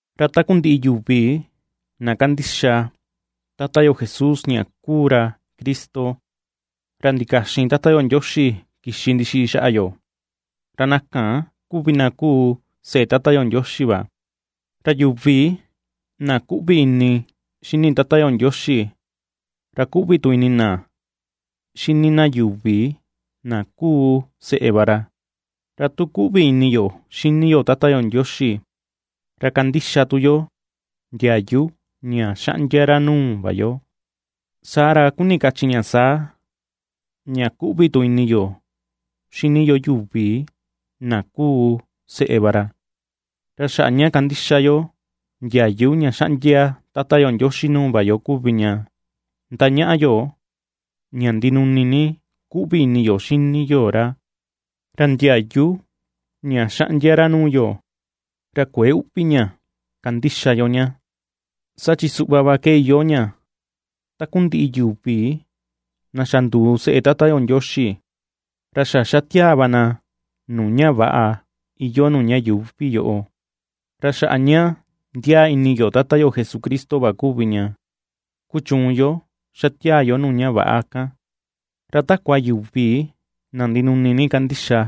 Ra takundiꞌi yuvi na kandixa Tata yo Jesús ña kuu ra Cristo, ra ndikaxin Tata yo Ndioxi kixi ndixiꞌi xaꞌa yo, ra na kan kuvi na kuu seꞌe Tata yo Ndioxi va; ra yuvi na kuꞌvi ini xini Tata yo Ndioxi, ra kuꞌvi tu ini na xini na yuvi na kuu seꞌe va ra. Ra tu kuꞌvi ini yo xini yo Tata yo Ndioxi, ra kandixa tu yo ndiayu ña xaꞌndia ra nuu va yo, saa ra kuni kachi ña saa, ña kuꞌvi tu ini yo xini yo yuvi na kuu seꞌe va ra. Ra xaꞌa ña kandixa yo ndiayu ña xaꞌndia Tata yo Ndioxi nuu va yo kuvi ña ndañaꞌa yo ña ndinuni ni kuꞌvi ini yo xini yo ra, ra ndiayu ña xaꞌndia ra nuu yo, ra kuëe uꞌvi ña kandixa yo ña. Saa chi suꞌva va ke iyoo ña, takundiꞌi yuvi na xa nduu seꞌe Tata yo Ndioxi, ra xa ^xatiaa va na nuu ña väꞌa iyoo nuu ña yuuvi yoꞌo. Ra xaꞌa ña ndiaa ini yo Tata yo Jesucristo va kuvi ña ^kuchuun yo ^xatiaa yo nuu ña väꞌa kan. Ra takua yuvi na ndinuni ni kandixa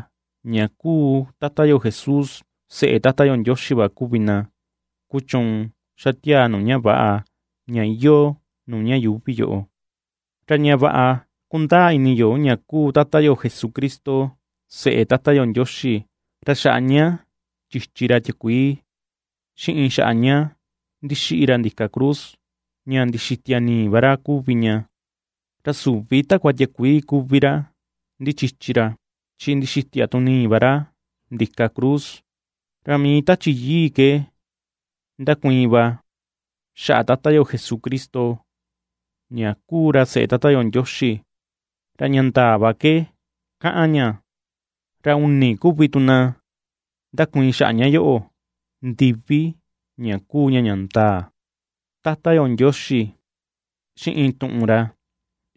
ña kuu Tata yo Jesús seꞌe Tata yo Ndioxi va kuvi na ^kuchuun ^xa tiaa nuu ña väꞌa, ña iyoo nuu ña yuuvi yoꞌo. Ra ña vaꞌa kundaa ini yo ña kuu Tata yo Jesucristo seꞌe Tata yo Ndioxi, ra xaꞌa ña chichi ra tiakuii, xiꞌin xaꞌa ña ndixiꞌi ra ndika cruz ña ndixitia nii va ra kuvi ña; ra süvi takua tiakuii kuvi ra ndichichi ra, chi ndixitia tu nii va ra ndika cruz; ra mii Tachi Yii ke ndakuiin va xaꞌa Tata yo Jesucristo ña kuu ra seꞌe Tata yo Ndioxi, ra ña ndaa va ke kaꞌan ña. Ra uni kuvi na ndakuiin xaꞌa ña yoꞌo ndivi ña kuu ña ña ndaa: Tata yo Ndioxi, xiꞌin Tuꞌun ra,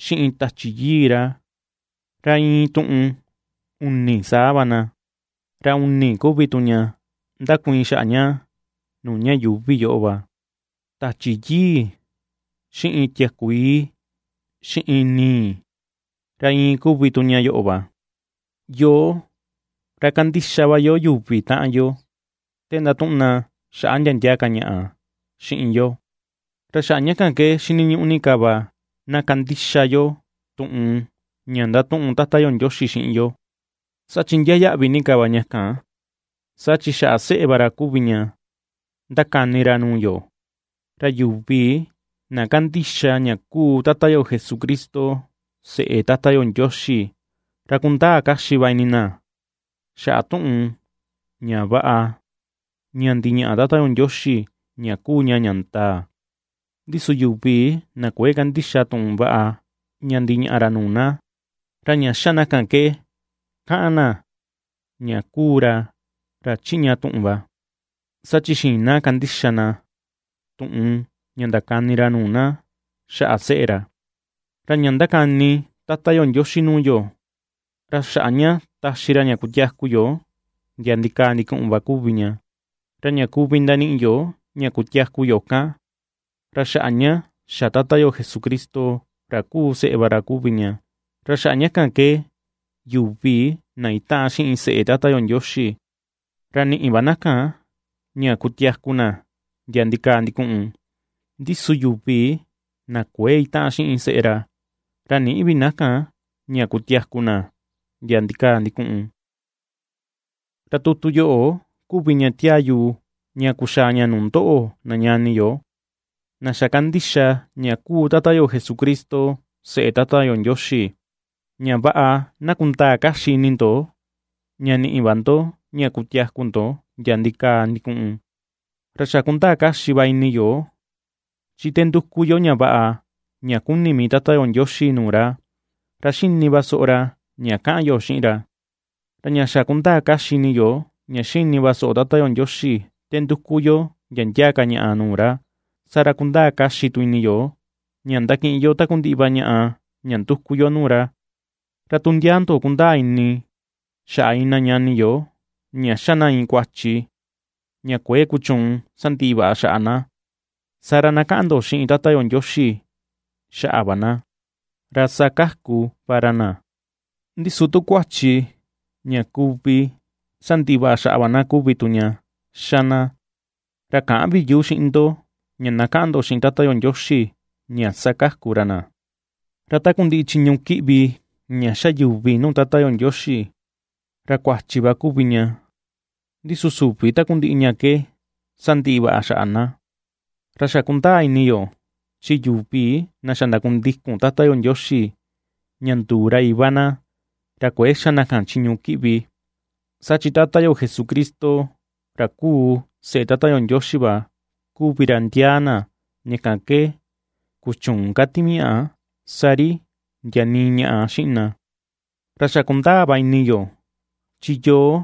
xiꞌin Tachi Yii ra; ra iin tuꞌun uni saa va na. Ra uni kuvi tu ña ndakuiin xaꞌa ña nuu ña yuuvi yoꞌo va: Tachi Yii, xiꞌin tiakuii, xiꞌin nii; ra iin kuvi tu ña yoꞌo va. Yoo, ra kandixa va yo yuvi taꞌan yo te ndatuꞌun na xaꞌa ndia ndia ka ñaꞌa xiꞌin yo, ra xaꞌa ña kan ke xiniñuꞌu ni ka va na kandixa yo tuꞌun ña ndatuꞌun Tata yo Ndioxi xiꞌin yo, saa chi ndiaa yaꞌvi ni ka va ña kan; saa chi xaꞌa seꞌe va ra kuvi ña ndakani ra nuu yo. Ra yuvi na kandixa ña kuu Tata yo Jesucristo seꞌe Tata yo Ndioxi, ra kundaa kaxi va ini na xaꞌa tuꞌun ña vaꞌa ña ndiñaꞌa Tata yo Ndioxi ña kuu ña ña ndaa. Ndi su yuvi na kuëe kandixa tuꞌun vaꞌa ña ndiñaꞌa ra nuu na, ra ña xa na kan ke kaꞌan na ña kuu ra ra chiꞌña tuꞌun va, saa chi xïin na kandixa na tuꞌun ña ndakani ra nuu na xaꞌa seꞌe ra. Ra ña ^ndakani Tata yo Ndioxi nuu yo, ra xaꞌa ña taxi ra ña kutiaku yo ndia ndikaa ndikuꞌun va kuvi ña, ra ña kuvi ndaniꞌi yo ña kutiaku yo kan, ra xaꞌa ña xa Tata yo Jesucristo, ra kuu seꞌe va ra kuvi ña. Ra xaꞌa ña kan ke yuvi na itaꞌan xiꞌin seꞌe Tata yo Ndioxi, ra niꞌi va na kan ña kutiaku na ndia ndikaa ndikuꞌun; ndi su yuvi na kuëe itaꞌan xiꞌin seꞌe ra, ra nïꞌi vi na kan ña kutiaku na ndia ndikaa ndikuꞌun. Ra tutu yoꞌo kuvi ña tiaa yu ña kuxaa ña nuu ndoꞌo na ñani yo, na xa kandixa ña kuu Tata yo Jesucristo seꞌe Tata yo Ndioxi, ña vaꞌa na kundaa kaxi ini ndo ña niꞌi va ndo ña kutiaku ndo ndia ndikaa ndikuꞌun. Ra xa kundaa kaxi va ini yo, chi te nduku yo ña vaꞌa ña kuni mii Tata yo Ndioxi nuu ra, ra xini va soꞌo ra ña kaꞌan yo xiꞌin ra. Ra ña xa kundaa kaxi ini yo ña xini va soꞌo Tata yo Ndioxi te nduku yo ndia ndia ka ñaꞌa nuu ra, saa ra kundaa kaxi tu ini yo ña ndakiꞌin yo takundiꞌi va ñaꞌa ña ^nduku yo nuu ra. Ra tu ndia ndo kundaa ini xaꞌa iin na ñani yo ña xa na iin kuachi ña kuëe kuchuun sandiꞌi vaꞌa xaꞌa na, saa ra na kaꞌan ndo xiꞌin Tata yo Ndioxi xaꞌa va na, ra sakaku va ra na. Ndi su tu kuachi ña kuvi sandiꞌi vaꞌa xaꞌa va na kuvi tu ña xa na, ra käꞌan vi yu xiꞌin ndo ña na kaꞌan ndo xiꞌin Tata yo Ndioxi ña sakaku ra na. Ra takundiꞌi chiñu kiꞌvi ña xa yuvi nuu Tata yo Ndioxi, ra kuachi va kuvi ña; ndi su süvi takundiꞌi ña ke sandiꞌi vaꞌa xaꞌa na. Ra xa kundaa ini yo, chi yuvi na xa ndakundikun Tata yo Ndioxi ña nduu ra Iva na, ra kuëe xa ka na chiñu kiꞌvi; saa chi Tata yo Jesucristo, ra kuu seꞌe Tata yo Ndioxi va kuvi ra ndiaa na, ña kan ke ^kuchüun ka timiaꞌa sa ri ndia nii ñaꞌa xiꞌin na. Ra xa kundaa va ini yo, chi yoo,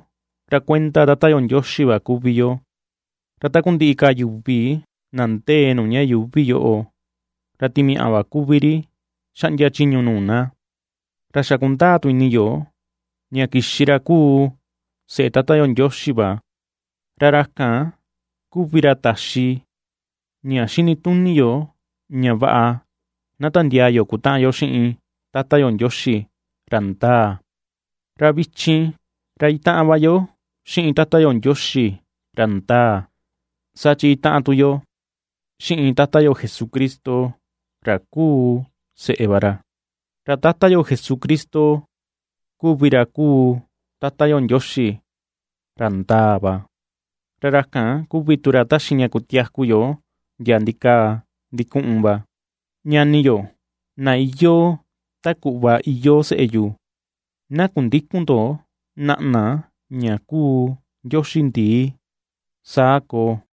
ra kuenda Tata yo Ndioxi va kuvi yo, ra takundiꞌi ka yuvi na ndee nuu ña yuuvi yoꞌo, ra timiaꞌa va kuvi ri xaꞌndia chiñu nuu na. Ra xa kundaa tu ini yo ña kixi ra kuu Seꞌe Tata yo Ndioxi va, ra ra kan kuvi ra taxi ña xini tuni yo ña vaꞌa na tandiaa yo kutaꞌan yo xiꞌin Tata yo Ndioxi, ra ndaa. Ra vichin, ra itaꞌan va yo xiꞌin Tata yo Ndioxi, ra ndaa, saa chi itaꞌan tu yo xiꞌin Tata yo Jesucristo ra kuu seꞌe va ra. Ra Tata yo Jesucristo kuvi ra kuu Tata yo Ndioxi, ra ndaa va, ra ra kan kuvi tu ra taxi ña kutiaku yo ndia ndikaa ndikuꞌun va. Ñani yo, na iyoo ta kuꞌva iyoo seꞌe yu, na kundïkun ndo naꞌna ña kuu ndioxi ndii. Saa koo.